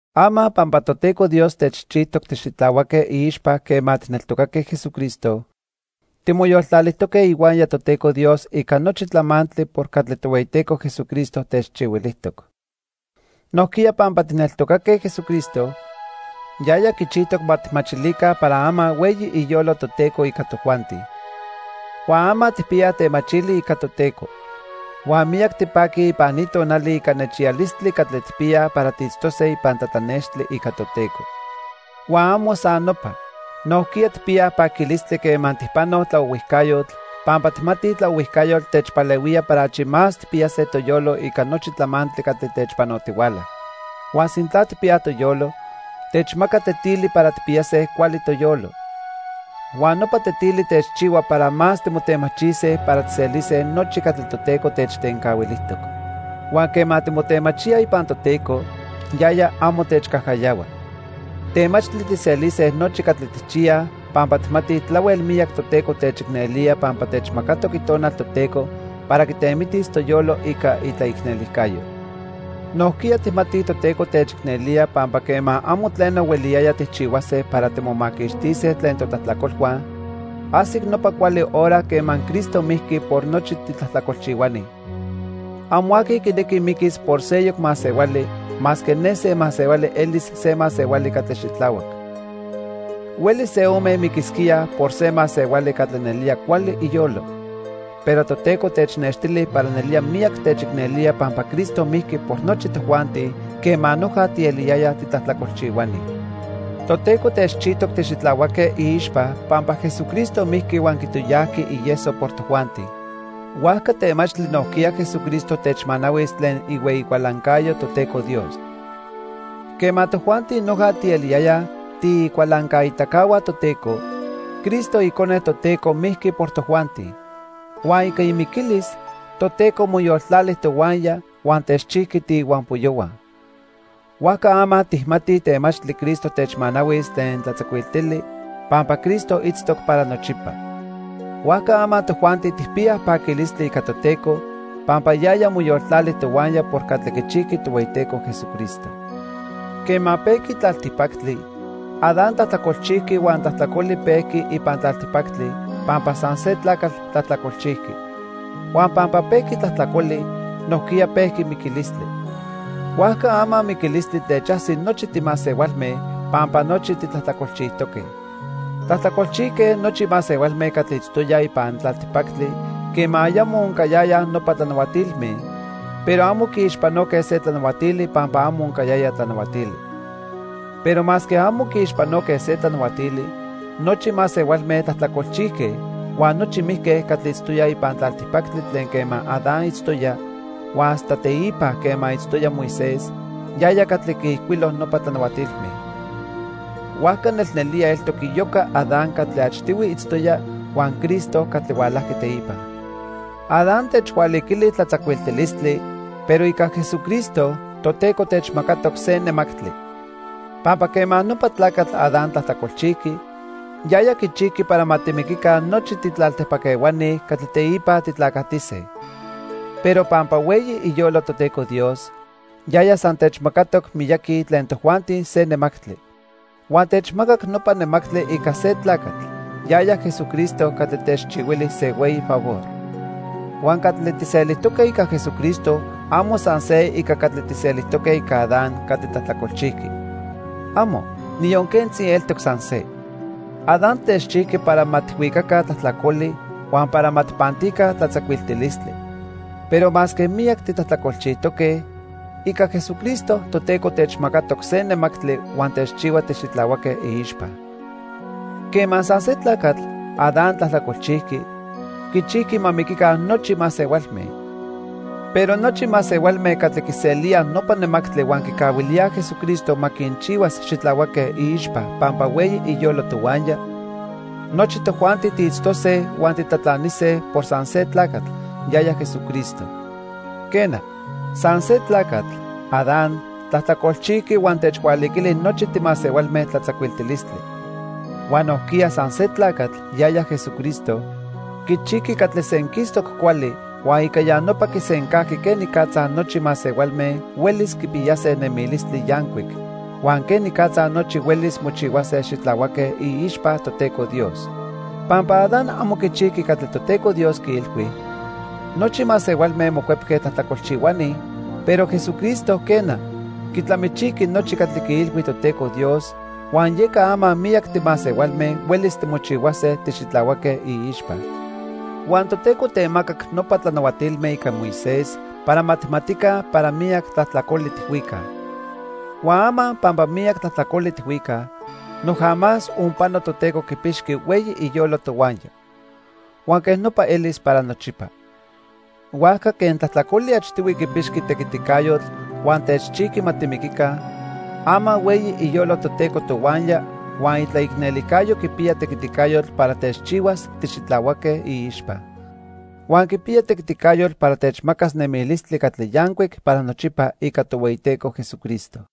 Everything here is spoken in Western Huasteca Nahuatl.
Ama, pampa Toteco Dios techchijtoc tixitlahuaque iixpa quema tijneltocatoque Jesucristo, timoyoltlalijtoque ihuaya Toteco Dios ica nochi tlamantli por catli Tohueyiteco Jesucristo techchihuilijtoc. Nojquiya pampa tijneltocatoque Jesucristo, yaya quichijtoc ma tijmachilica para ama hueyi iyolo Toteco ica tojuanti. Huan ama tijpiyaj temachili ica Toteco. Huan miyac tipaquij ipan ni tonali ica nechiyalistli catli tijpiyaj para tiitztose ipan tlatlanextli ica Toteco. Huan amo san nopa, nojquiya tijpiyaj paquilistli quema tijpanoj tlaohuijcayotl pampa tijmatij tlaohuijcayotl techpalehuía para achi más tijpiyase toyolo ica nochi tlamantli catli techpanotihuala. Huan sintla tijpiyaj toyolo, techmaca tetili para tijpiyase cuali toyolo. Huan nopa tetili techchihua para más timotemachise para tijselise nochi catli Toteco techtencahuilijtoc. Huan quema timotemachíaj ipan Toteco, yaya amo techcajcayahua. Temachtli tijselise nochi catli tijchiyaj pampa tijmatij tlahuel miyac Toteco techicnelía pampa techmacatoc Itonal Toteco para quitemitis toyolo ica itlaicnelijcayo. Nojquiya tijmatij Toteco techicnelía pampa quema amo tleno hueliyaya tijchihuase para timomaquixtise tlen totlajtlacolhua, ajsic nopa cuali hora quema Cristo mijqui por nochi titlajtlacolchihuani. Amo aqui quinequi miquis por seyoc masehuali masque ne se masehuali elis se masehuali catli xitlahuac. Huelis se ome miquisquíaj por se masehuali catli nelía cuali iyolo. Pero Toteco technextili para nelía miyac techicnelía pampa Cristo mijqui por nochi tojuanti quema noja tieliyayaj titlajtlacolchihuani. Toteco techchijtoc tixitlahuaque iixpa pampa Jesucristo mijqui huan quitoyajqui ieso por tojuanti. Huajca temachtli nojquiya Jesucristo techmanahuis tlen ihueyi cualancayo Toteco Dios. Quema tojuanti noja tieliyayaj tiicualancaitacahua Toteco, Cristo icone Toteco mijqui por tojuanti. Huan ica imiquilis, Toteco moyoltlali tohuaya huan techchijqui tiihuampoyohua. Huajca ama tijmatij temachtli Cristo techmanahuis tlen tlatzacuiltili pampa Cristo itztoc para nochipa. Huajca ama tojuanti tijpiyaj paquilistli ica Toteco pampa yaya moyoltlali tohuaya por catli quichijqui Tohueyiteco Jesucristo. Quema pejqui tlaltipactli, Adán tlajtlacolchijqui huan tlajtlacoli pejqui ipan tlaltipactli pampa san se tlacatl tlajtlacolchijqui. Huan pampa pejqui tlajtlacoli, nojquiya pejqui miquilistli. Huajca ama miquilistli techajsi nochi timasehualme, pampa nochi titlajtlacolchijtoque. Tlajtlacolchijque nochi masehualme catli itztoyaj ipan tlaltipactli quema ayamo oncayayaj nopa tlanahuatilme, pero amo quiixpanoque se tlanahuatili pampa amo oncayaya tlanahuatili. Pero masque amo quiixpanoque se tlanahuatili, nochi masehualme tlajtlacolchijque huan nochi mijque catli itztoyaj ipan tlaltipactli tlen quema Adán itztoya huan hasta teipa quema itztoya Moisés, yaya catli quiijcuilo nopa tlanahuatilme. Huajca nelnelía eltoc iyoca Adán catli achtihui itztoya huan Cristo catli hualajqui teipa. Adán techhualiquili tlatzacuiltilistli, pero ica Jesucristo, Toteco techmacatoc se nemactli. Pampa quema nopa tlacatl Adán tlajtlacolchijqui, yaya quichijqui para ma timiquica nochi titlaltipac ehuani catli teipa titlacatise. Pero pampa hueyi iyolo Toteco Dios, yaya san techmacatoc miyaqui tlen tojuanti se nemactli. Huan techmacac nopa nemactli ica se tlacatl, yaya Jesucristo catli techchihuili se hueyi favor. Huan catli tijselijtoque ica Jesucristo amo san se ica catli tijselijtoque ica Adán catli tlajtlacolchijqui. ¡Amo, niyon quentzi eltoc san se! Adán techchijqui para ma tijhuicaca tlajtlacoli huan para ma tijpantica tlatzacuiltilistli. Pero masque miyac titlajtlacolchijtoque, ica Jesucristo Toteco techmacatoc se nemactli huan techchihua tixitlahuaque iixpa. Quema san se tlacatl, Adán, tlajtlacolchijqui, quichijqui ma miquica nochi masehualme. Pero nochi masehualme catli quiselíaj nopa nemactli huan quicahuilíaj Jesucristo ma quinchihuas xitlahuaque iixpa pampa hueyi iyolo tohuaya, nochi tojuanti tiitztose huan titlatlanise por san se tlacatl, yaya Jesucristo. Quena, san se tlacatl, Adán, tlajtlacolchijqui huan techhualiquili nochi timasehualme tlatzacuiltilistli. Huan nojquiya san se tlacatl, yaya Jesucristo, quichijqui catli senquistoc cuali huan ica ya nopa quisencajqui quenicatza nochi masehualme huelis quipiyase nemilistli yancuic, huan quenicatza nochi huelis mochihuase xitlahuaque iixpa Toteco Dios. Pampa Adán amo quichijqui catli Toteco Dios quiilhui, nochi masehualme mocuepque tlajtlacolchihuani, pero Jesucristo quena, quitlamichijqui nochi catli quiilhui Toteco Dios, huan yeca ama miyac timasehualme huelis timochihuase tixitlahuaque iixpa. Huan Toteco temacac nopa tlanahuatilme ica Moisés para ma tijmatica para miyac tlajtlacoli tijhuicaj. Huan ama pampa miyac tlajtlacoli tijhuicaj, noja más onpano Toteco quipixqui hueyi iyolo tohuaya. Huan quej nopa elis para nochipa. Huajca quen tlajtlacoli achtihui quipixqui tequiticayotl huan techchijqui ma timiquica, ama hueyi iyolo Toteco tohuaya huan itlaicnelijcayo quipiya tequiticayotl para techchihuas tixitlahuaque iixpa. Huan quipiya tequiticayotl para techmacas nemilistli catli yancuic para nochipa ica Tohueyiteco Jesucristo.